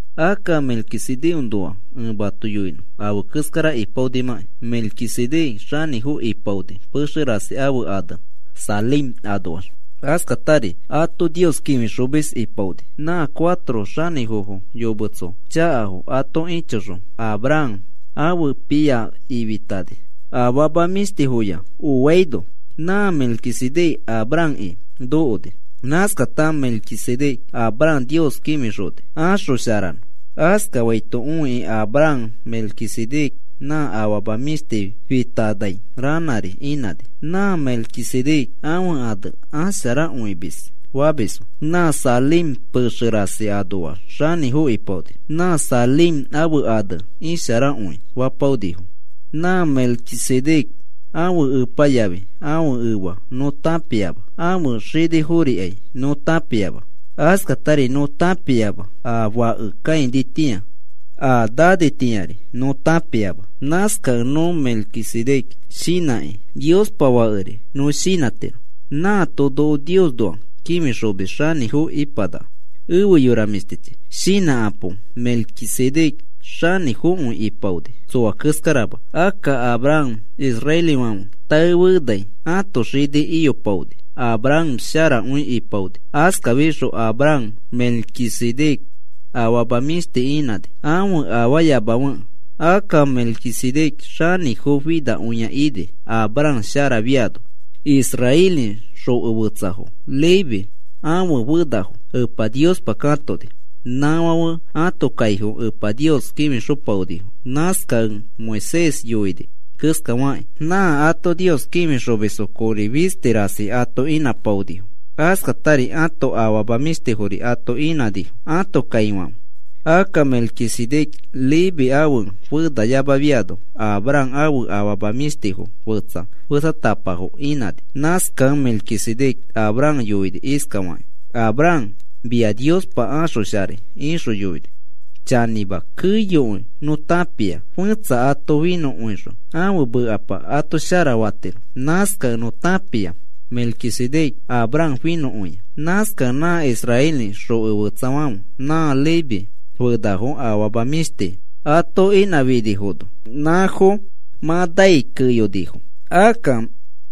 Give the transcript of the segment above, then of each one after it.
Akka Melquisedecnoa ẽ mato yoinõ afe keskara ipaonimãki. Melquisedec xanĩfo ipaoni pexe rasi ãfe ane Salem anoax. Askatari ato Nios kĩfixomis ipaoni. Nã cuatro xanĩfofo yometso chakafo ato ĩchoxõ Abraham ãfe pia ifitani, afama mĩshtifoya oaino, nã Melquisedec Abrahamki nokoni. Nãskata Melquisedec Abraham Nios kĩfixoni axosharanõ. Askafaito õikĩ Abraham Melquisedec nã afama mĩshti fitanai ranãri inãni. Nã Melquisedec ãfe ane “Asharakõimis,” famisfo. Nã Salem pexe rasi anoax xanĩfo ipaoni. Nã Salem ãfe ane “Isharakõi,” fapaonifo. Nã Melquisedec ãfe epa yafi ãfe efa nõ tãpiama. Ãfe xiniforikai nõ tãpiama. Askatari nõ tãpiama a fake kãinitĩa. A nanitĩari nõ tãpiama. Nãskakẽ nõ Melquisedec shinãkĩ Niospa Fakeri nõ shinãtiro. Nãato noko Niosnoa kĩfixomis xanĩfo ipanaka. Efe yora mĩshtichi, shinãkapo. Melquisedec xanĩfokõi ipaoni tsoa keskarama. Akka Abraham israelifãfe taefenai ãto xini iyopaoni. Abraham sharakõi ipaoni. Askafixõ Abraham Melquisedec afama mĩshti inãni ãfe afaayamafekẽ. Akka Melquisedec xanĩfo finakõia ini Abraham sharafiano. Israeli xoko fetsafo Leví ãfe fenafo Epa Niospa katoni. Nãfãfe ãto kaifo Epa Nios kĩfixopaonifo. Nãskakẽ Moisés yoini keskafakĩ nã ato Nios kĩfixomisfo kori fisti rasi ato inãpaonifo. Askatari ãto afama mĩshtifori ato inãnifo ãto kaifãfe. Akka Melquisedec Leví ãfe fenayamafiano Abraham ãfe afama mĩshtifo fetsa fetsatapafo inãni. Nãskakẽ Melquisedec Abraham yoini iskafakĩ: “Abraham, mia Niospa axosharai,” ixõ yoini. Chanĩma, keyokõi nõ tãpikõia fẽtsa ato finõkõixõ ãfe mekapa ato shara fatiro. Nãskakẽ nõ tãpia Melquisedec Abraham finõkõia. Nãskakẽ nã israeli xoko fetsafãfe nã Leví fenafo afama mĩshti ato inãfinifono nãfo mã nai keyonifo. Akka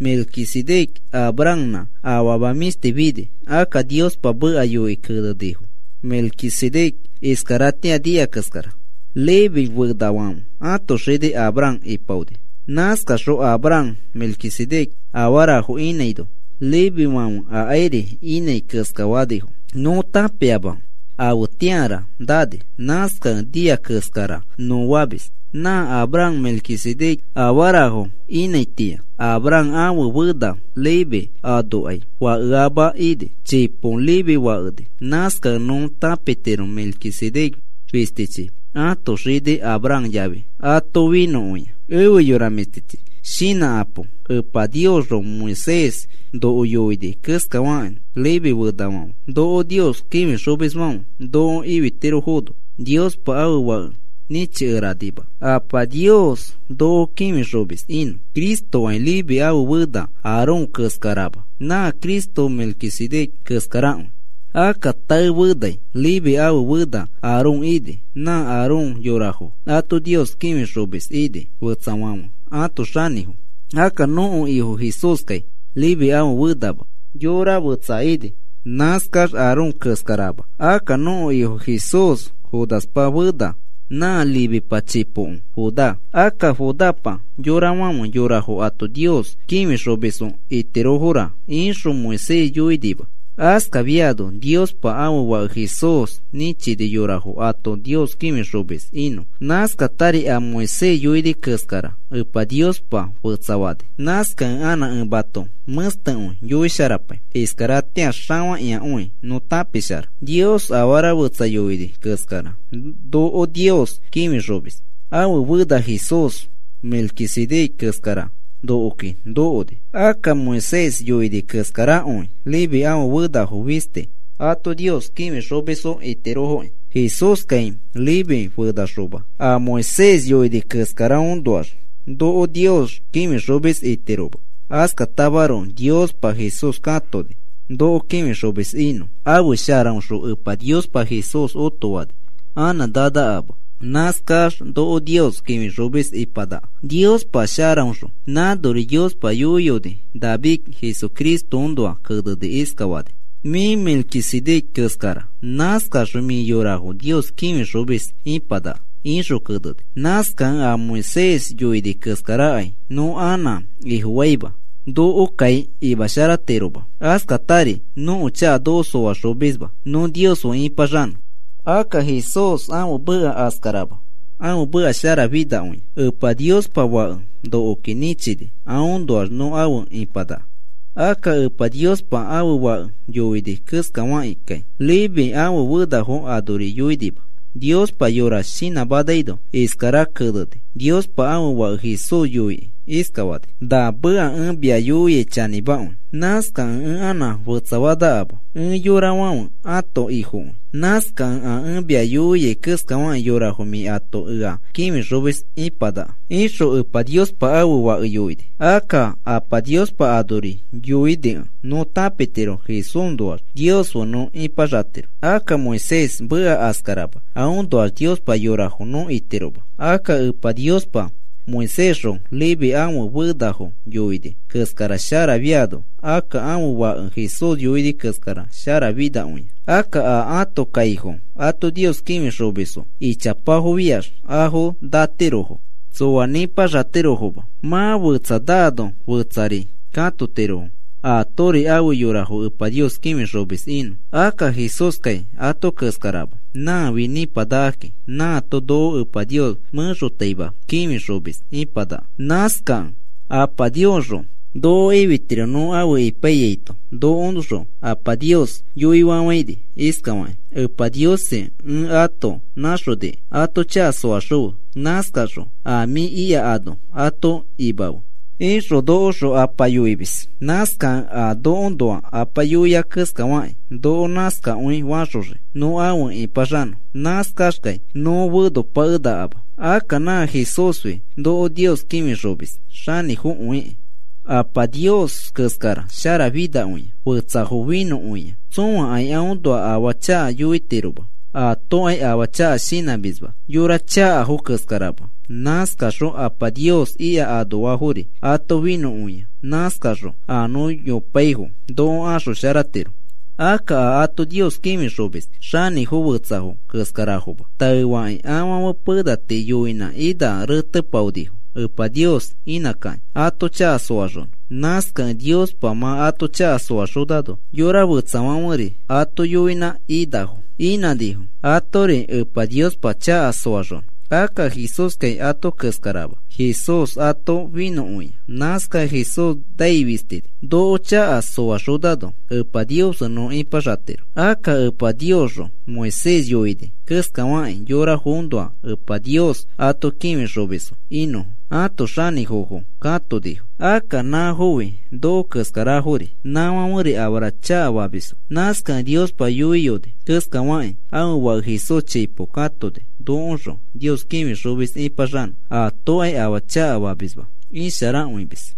Melquisedec Abrahamnã afama mĩshti fini. Akka Niospa meka yoikĩ kenenifo Melquisedec iskaratĩa nia keskara. Leví fenafãfe ãto xini Abraham ipaoni. Nãskaxõ Abraham Melquisedec afarafo inãino Levífãfe akairi inãi keskafanifo. Nõ tãpiama afetĩara nani. Nãskakẽ nia keskara nõ famis. Nã Abraham Melquisedec afarafo inãitĩa Abraham ãfe fena Leví anokai fakeama ini. Chipo Leví fakeni. Nãskakẽ nõ tãpitiro Melquisedec fistichi ãto xini Abraham yafi ato finõkõia. Efe yora mĩshtichi, shinãkapo. Epa Niosxõ Moisés noko yoini keskafakĩ Leví fenafãfe noko Nios kĩfixomisfãfe noko ifitirofono Niospa ãfe Fake nĩchikeranima Apa Nios noko kĩfixomis inõ. Cristokai Leví ãfe fena Aarón keskarama. Nã Cristo Melquisedec keskarakõi. Akka tae fenai Leví ãfe fena Aarón ini. Nã Aarón yorafo ato Nios kĩfixomis ini fetsafãfe ãto xanĩfo. Akka nõko Ifo Jesúskai Leví ãfe fenama, xoko fetsa ini. Nãskax Aarón keskarama. Akka nõko Ifo Jesús Judapa fena. Nã Levipa chipoko Judá. Akka, “Judapa yorafãfe yorafo ato Nios kĩfixomisfo itirofora,” ixõ Moisés yoinima. Askafiano Niospa ãfe Fake Jesús nĩchini yorafo ato Nios kĩfixomis inõ. Nãskatari a Moisés yoini keskara Epa Niospa fetsafani. Nãskakẽ anã ẽ mato mẽstekõi yoisharapai. Iskaratĩa xafakĩakõi nõ tãpishara Nios afara fetsa yoini keskara noko Nios kĩfixomis ãfe fena Jesús, Melquisedec keskara nokoki nokoni. Akka Moisés yoini keskarakõi Leví ãfe fenafo fisti ato Nios kĩfixomisfo itirofoki. Jesúskai Leví fenaxoma a Moisés yoini keskaraõnoax noko Nios kĩfixomis itiroma. Askatamaroko Niospa Jesús katoni noko kĩfixomis inõ. Ãfe sharaõxõ Epa Niospa Jesús otofani. Anã nanakama. Nãskax noko Nios kĩfixomis ipanaka Niospa sharaõxõ. Nãnori Niospa yoiyoni David Jesucristoõnoa kenekĩ iskafani: Mĩ Melquisedec keskara. Nãskaxõ mĩ yorafo Nios kĩfixomis ipanaka, ixõ keneni. Nãskakẽ a Moisés yoini keskarakai nõ anã ifofaima. Nokokai imasharatiroma. Askatari nõko chaka noko soaxomisma nõ Nios fe ĩpaxanõ. Akka Jesús ãfe meka askarama. Ãfe meka sharafinakõia. Epa Niospa Fake nokoki nĩchini aõnoax nõ afe ipanaka. Akka Epa Niospa ãfe Fake yoini keskafakĩkai Leví ãfe fenafo anori yoinima. Niospa yora shinãmanaino iskara keneni, Niospa ãfe Fake Jesús yoikĩ iskafani: Na meka ẽ mia yoiai chanĩmakõi. Nãskakẽ ẽ anã fetsapakenakama. Ẽ yorafãfe ãto Ifokõi. Nãskakẽ a ẽ mia yoiai keskafakĩ yorafo mĩ ato ea kĩfixomis ipanaka, ixõ Epa Niospa ãfe Fake yoini. Akka Apa Niospa nãnori yoinikẽ nõ tãpitiro Jesúsnoax Nios fe nõ ipaxatiro. Akka Moisés meka askarama. Aõnoax Niospa yorafo nõ itiroma. Akka Epa Niospa Moisésxõ Leví ãfe fenafo yoini keskara sharafiano akka ãfe Fake Jesús yoini keskara sharafinakõia. Akka a ãto kaifo ato Nios kĩfixomisfo ichapafofiax afo natirofo. Tsoa nĩpaxatirofoma. Mã fetsa nano fetsari katotirofo atori ãfe yorafo Epa Nios kĩfixomis inõ. Akka Jesúskai ato keskarama. Nãfi nĩpanakakĩ nãato noko Epa Nios mẽxotaima kĩfixomis ipanaka. Nãskakẽ Apa Niosxõ noko ifitiro nõ afe ipaiyaito nokoõxõ Apa Nios yoifafãini iskafakĩ: “Epa Niosi, ẽ ato nãxoniki, ato chaka soaxõfe. Nãskaxõ a mĩ ika ano ato imafe,” ixõ nokoõxõ Apa yoimis. Nãskakẽ a nokoõnoa Apa yoia keskafakĩ noko nãskakõi faxoxii nõ afe ĩpaxanõ. Nãskaxkai nõ fenopakenakama. Akka nã Jesúsfi noko Nios kĩfixomis xanĩfokõikĩ. Apa Nios keskara sharafinakõia. Fetsafo finõkõia. Tsõakai aõnoa afaa chaka yoitiroma. Aatokai afaa chaka shinãmisma yora chakafo keskarama. Nãskaxõ Apa Nios ika anoafori ato finõkõia. Nãskaxõ a nõ yopaifo noko axosharatiro. Akka a ato Nios kĩfixomis xanĩfo fetsafo keskarafoma. Taefakĩ afãfe pena tii yoinã ina retepaonifo Epa Nios inãkakĩ ato chaka soaxonõ. Nãskakẽ Niospa mã ato chaka soaxonano yora fetsafãferi ato yoinã inafo inãnifo, atori Epa Niospa chaka soaxonõ. Akka Jesúskai ato keskarama. Jesús ato finõkõia. Nãskakẽ Jesús nai fistini noko chaka soaxonano Epa Nios fe nõ ipaxatiro. Akka Epa Niosxõ Moisés yoini keskafakĩ yorafoõnoa Epa Nios ato kĩfixomisfo inõfo ãto xanĩfofo katonifo. Akka nãfofi noko keskarafori nãfãferi afara chakafamisfo. Nãskakẽ Niospa yoiyoni keskafakĩ ãfe Fake Jesús chipo katoni nokoõxõ Nios kĩfixomis ĩpaxanõ. Aatokai afaa chakafamisma. Isharakõimis.